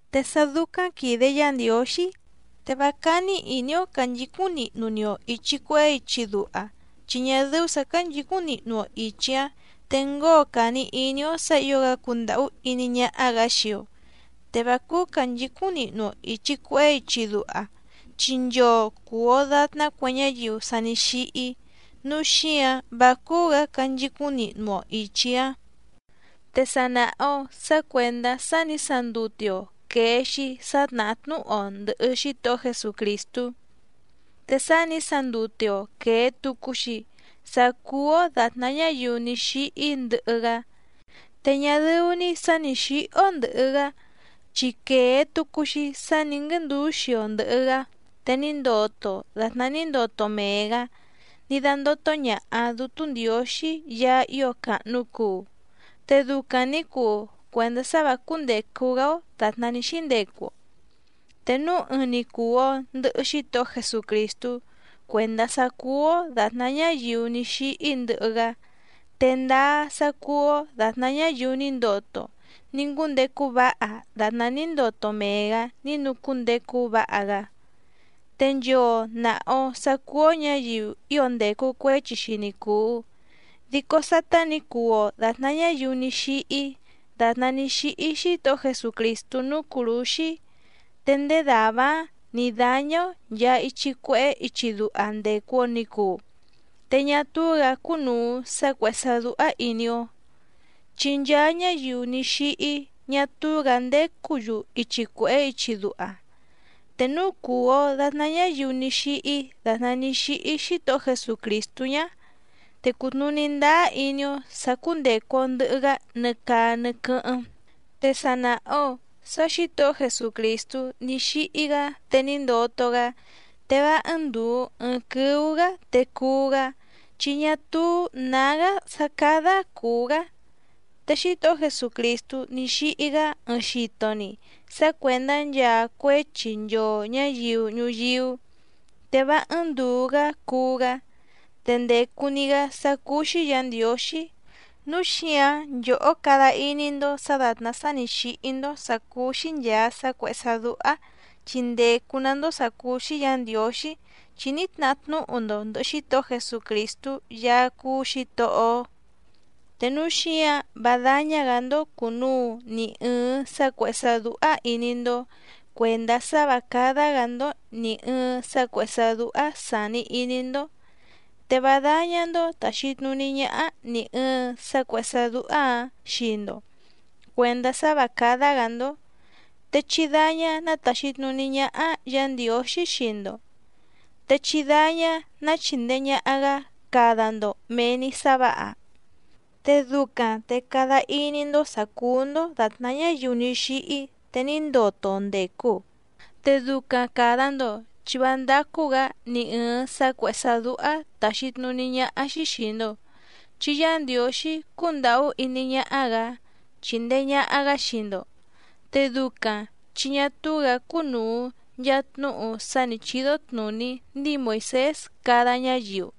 Te sá dúcáⁿ quìde Yá Ndiǒxí, te vá cání ìní‑ó cànchicúⁿ nihnu‑ni‑o ìchi cuehé ichi duha, chi ñá dɨ́ú sǎ cánchǐcúⁿ nihnu‑o ìchi‑áⁿ te ngóo càni iní‑ó sǎ ǐo‑gá cundàhú iní ñáhá‑gǎ xii‑o. Te vá cúú cànchicúⁿ nihnu‑o ìchi cuehé ichi duha, chi nchoo cùu‑o datná cue ñáyiu sa ní xíhí, núu xíǎⁿ vá cúú‑gǎ canchicúⁿ nihnu‑o ìchi‑áⁿ. Te sa nàha‑o sá cuèndá sá nǐ sandute‑o quèe‑xi sá tnàhá tnúhu‑o ndɨ̀hɨ Xítohó Jesucrìstú. Te sá nǐ sandute‑o quèe tucu‑xi sá cúú‑ó dàtná ñáyiu ní xíhí ndɨhɨ‑gá. Te ñá dɨ́ú‑ní sǎ nǐ xíhí‑ó ndɨ̀hɨ‑gá chi quèe tucu‑xi sá nǐ nguɨ́ndǔxi‑o ndɨ̀hɨ‑gá te ní ndoto‑o dàtná ní ndoto mee‑gǎ ní dándótó ñàha Dútú Ndiǒxí Yaá ío càhnu cuu, te ducaⁿ nǐ cuu cuèndá sá vǎ cúndècu‑gá‑ó dàtná ní xíndecu‑o. Te núu ɨɨⁿ‑ni cùu‑o ndɨhɨ Xítohó Jesucrìstú cuèndá sá cúú‑ó dàtná ñáyiu ní xíhí ndɨhɨ‑gá, te ndáá sá cúú‑ó dàtná ñáyiu ní ndoto ní ngúndecu váha dàtná ní ndoto mee‑gǎ ní nucúndecu váha‑gá. Te nchoo nàha‑o sá cúú‑ó ñǎyiu ío ndècu cuéchi‑xi ni cùu, dico sátá nǐ cuu‑o dàtná ñáyiu ní xíhí dàtná ní xíhí Xítohó Jesucrìstú núú cùrúxí, te ndéé dàvá‑áⁿ nǐ dáñá‑ó nchàa ichi cuehé ichi duha ndècu‑o ni cuu, te ñá túú‑gǎ cúnùu sá cuèhé sá dúhá ìní‑ó. Chi nchaa ñáyiu ní xíhí ñá túú‑gǎ ndécǔ‑yu ichi cuèhé ichi duha. Te núu cùu‑o datná ñáyiu ní xíhí dàtná ní xíhí Xítohó Jesucrìstú ñá, te cùtnuní ndáá iní‑ó sà cúndècu‑o ndɨhɨ‑gá nɨ caa nɨ quɨ́hɨ́ⁿ. Te sa nàha‑o sá Xǐtohó Jesucrìstú ní xíhí‑gá te ní ndoto‑gá te vá ɨ́ɨ́ⁿ ndùu ɨɨⁿ quɨ́ú‑gǎ te cuú‑gá, chi ñá túú nǎgá sá cádá cùú‑gá. Te Xítohó Jesucrìstú ní xíhí‑gá ɨɨⁿ xito‑ni sá cuèndá nchaa cuéchi nchoo ñǎyiu ñuyíú, te vá ɨ́ɨ́ⁿ ndùu‑gá cuú‑gá, te ndècu‑ni‑gá sá cúú‑xí Yǎ Ndiǒxí. Núu xíǎⁿ nchòhó cada iní‑ndó sǎ dàtná sá nǐ xíhí‑ndó vǎ cúndècu‑gá‑ndó sà cúú‑xí ìchi cuehé ichi duha, chi ndècu‑ná‑ndó sǎ cúú‑xí Yǎ Ndiǒxí, chi ní tnahá tnúhu‑ndo ndɨ̀hɨ Xítohó Jesucrìstú Yaá cúú Xǐtohó‑ó. Te núu xíǎⁿ vá dáñá‑gǎ‑ndó cùnuu ni ɨɨⁿ sá cuèhé sá dúhá ìní‑ndó cuèndá sá vǎ cádá‑gǎ‑ndó nì ɨɨⁿ sá cuèhé sá dúhá sàni iní‑ndó. Te vá dáñá‑ndó tàxi tnuní ñáhá nì ɨɨⁿ sá cuèhé sá dúhá‑ǎⁿ xii‑ndo cuèndá sá vǎ cádá‑gǎ‑ndó, te chí dáñá ná tàxi tnuní ñáhá Yǎ Ndiǒxí xii‑ndo, te chí dáñá ná chìndee ñaha‑gá cada‑ndo mèe‑ni sá vǎha, te ducaⁿ te cada iní‑ndó sǎ cúú‑ndó dàtná ñáyiu ní xíhí te ní ndoto ndècu. Te ducaⁿ càda‑ndo chi vá ndácú‑gǎ ni ɨ̀ɨⁿ sá cuèhé sá dúhá tàxi tnuní ñáhá‑xí xìi‑ndo, chi Yá Ndiǒxí cúndàhú iní ñáhá‑gǎ chíndèe ñaha‑gá xii‑ndo. Te ducaⁿ chi ñá túú‑gǎ cúnùu nchaa tnúhu sá nǐ chídó tnùní ndíi Moìsés cada ñáyiu.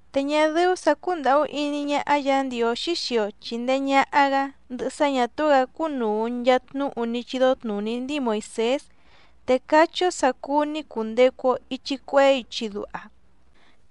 Te ñá dɨ́ú sǎ cúndàhú iní ñáhá Yǎ Ndiǒxí xii‑o chìndee ñaha‑gá ndɨhɨ sá ñà túú‑gǎ cúnùu nchaa tnúhu ní chídó tnùní ndíi Moìsés, te cachí‑ó sǎ cúú‑ní cùndecu‑o ichi cuehé ichi duha.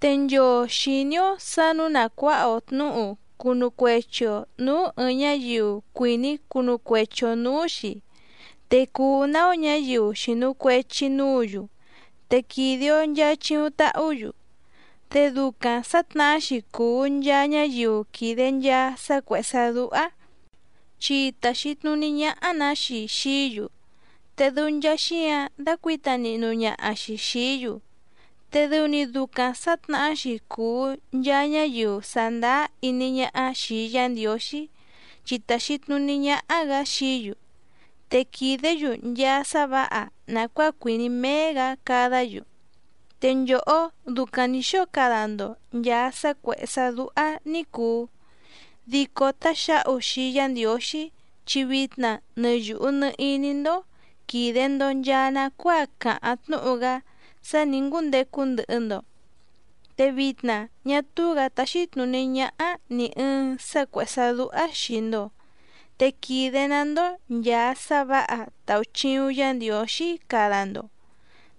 Te nchoo xìní‑ó sǎ nǔu na cuǎha‑o tnǔhu cunu cuechi‑o nǔú ɨ̀ɨⁿ ñáyiu cuìní cunu cuechi‑o nǔú‑xi, te cùu‑ná‑ó ñǎyiu xìnu cuechi núǔ‑yu te quìde‑o nchaa chiuⁿ tahú‑yu. Te ducaⁿ sǎtnahá‑xi cùu nchaa ñáyiu quìde nchaa sá cuèhé sá dúhá chi tàxi tnuní ñáhá‑nǎ‑xi xií‑yu, te dɨu nchaa xíǎⁿ dácuǐta nihnu ñaha‑xi xìí‑yu, te dɨu‑ni ducaⁿ sǎtnahá‑xi cùu nchaa ñáyiu sàndáá iní ñáhá xìi Yá Ndiǒxí chi tàxi tnuní ñáhá‑gǎ xií‑yu, te quìdé‑yu nchaa sá vǎha nàcuáa cuìní méé‑gǎ cadá‑yu. Te nchòhó ducaⁿ nǐ xóo cada‑ndo nchàa sá cuèhé sá dúhá ní cùu, dico táxǎhu xii Yá Ndiǒxí chi vitna nɨ yùhu nɨ iní‑ndó quìde‑ndo nchaa nacuáa càháⁿ tnúhu‑gá sá nǐ ngúndecu ndɨhɨ‑ndo. Te vitna ñá túú‑gǎ táxí tnùní ñáhá nì ɨɨⁿ sá cuèhé sá dúhá xìi‑ndo, te quìde‑ná‑ndó nchàa sá vǎha tàuchiuⁿ Yá Ndiǒxí cada‑ndo.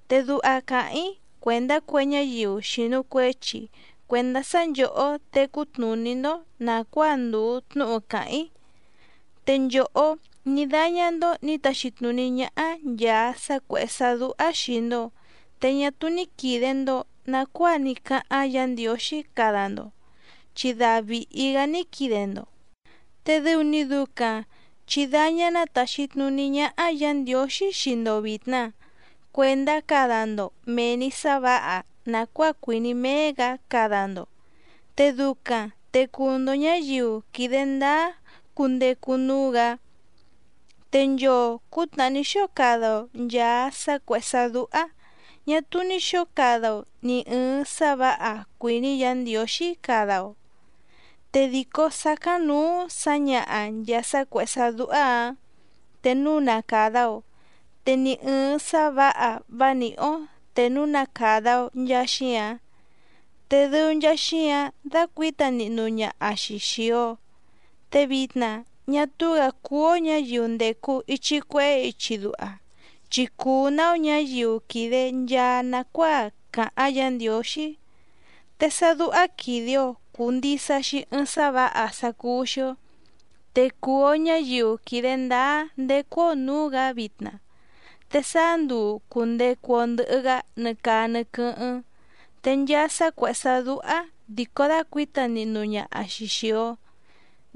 Te duha càháⁿ‑í cuèndá cue ñáyiu xìnu cuechi cuendá sá nchòhó tecú tnùní‑ndó nàcuáa ndùu tnúhu càháⁿ‑í. Te nchòhó ní dáñá‑ndó nǐ taxi tnùní ñáhá nchàa sá cuèhé sá dúhá xìi‑ndo, te ñá túú ní quìde‑ndo nacuáa ní cáháⁿ Yǎ Ndiǒxí cada‑ndo chi da vìhi‑gá ní quide‑ndo, te dɨu‑ni ducaⁿ chǐ dáñá ná tàxi tnuní ñáhá Yǎ Ndiǒxí xii‑ndo vìtna cuendá cada‑ndo mèe‑ni sá vǎha nàcuáa cuìní méé‑gǎ cada‑ndo, te ducaⁿ te cuu‑ndo ñǎyiu quìde ndáá cundecu núú‑gǎ. Te nchoo cǔtnàhá ní xóo cada‑o nchàa sá cuèhé sá dúhá ñà túú ní xǒo cada‑o nì ɨɨⁿ sá vǎha cuìní Yǎ Ndiǒxí cada‑o. Te dìcó sácáⁿnǔú sǎñaha nchàa sá cuèhé sá dúhá‑ǎⁿ te núu na càda‑o, te ni ɨ̀ɨⁿ sá vǎha vá nìhí‑ó te núu na càda‑o nchaa xíǎⁿ, te dɨu nchaa xíǎⁿ dácuǐta nihnu ñaha‑xi xìi‑o. Te vitna ñá túú‑gǎ cúú‑ó ñǎyiu ndècu ichi cuehé ichi duha, chi cùu‑ná‑ó ñǎyiu quìde nchaa nacuáa càháⁿ Yǎ Ndiǒxí. Te sá dúhá quìde‑o cuu ndisa‑xi ɨɨⁿ sá vǎha sá cúú‑xí‑ó, te cùu‑o ñáyiu quìde ndáá ndécú‑ó nǔú‑gǎ vitna, te sáá nduu cùndecu‑o ndɨhɨ‑gá nɨ caa nɨ quɨ́hɨ́ⁿ. Te nchaa sá cuèhé sá dúhá dìcó dácuǐta nihnu ñaha‑xi xìi‑o,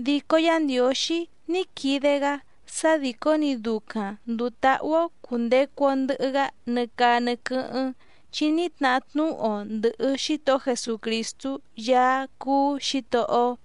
dico Yá Ndiǒxí ní quide‑gá sá dìcó‑ni ducaⁿ ndùu táhú‑ó cùndecu‑o ndɨhɨ‑gá nɨ caa nɨ quɨ́hɨ́ⁿ, chi ní tnahá tnúhu‑o ndɨ̀hɨ Xítohó Jesucrìstú Yaá cúú Xǐtohó‑ó.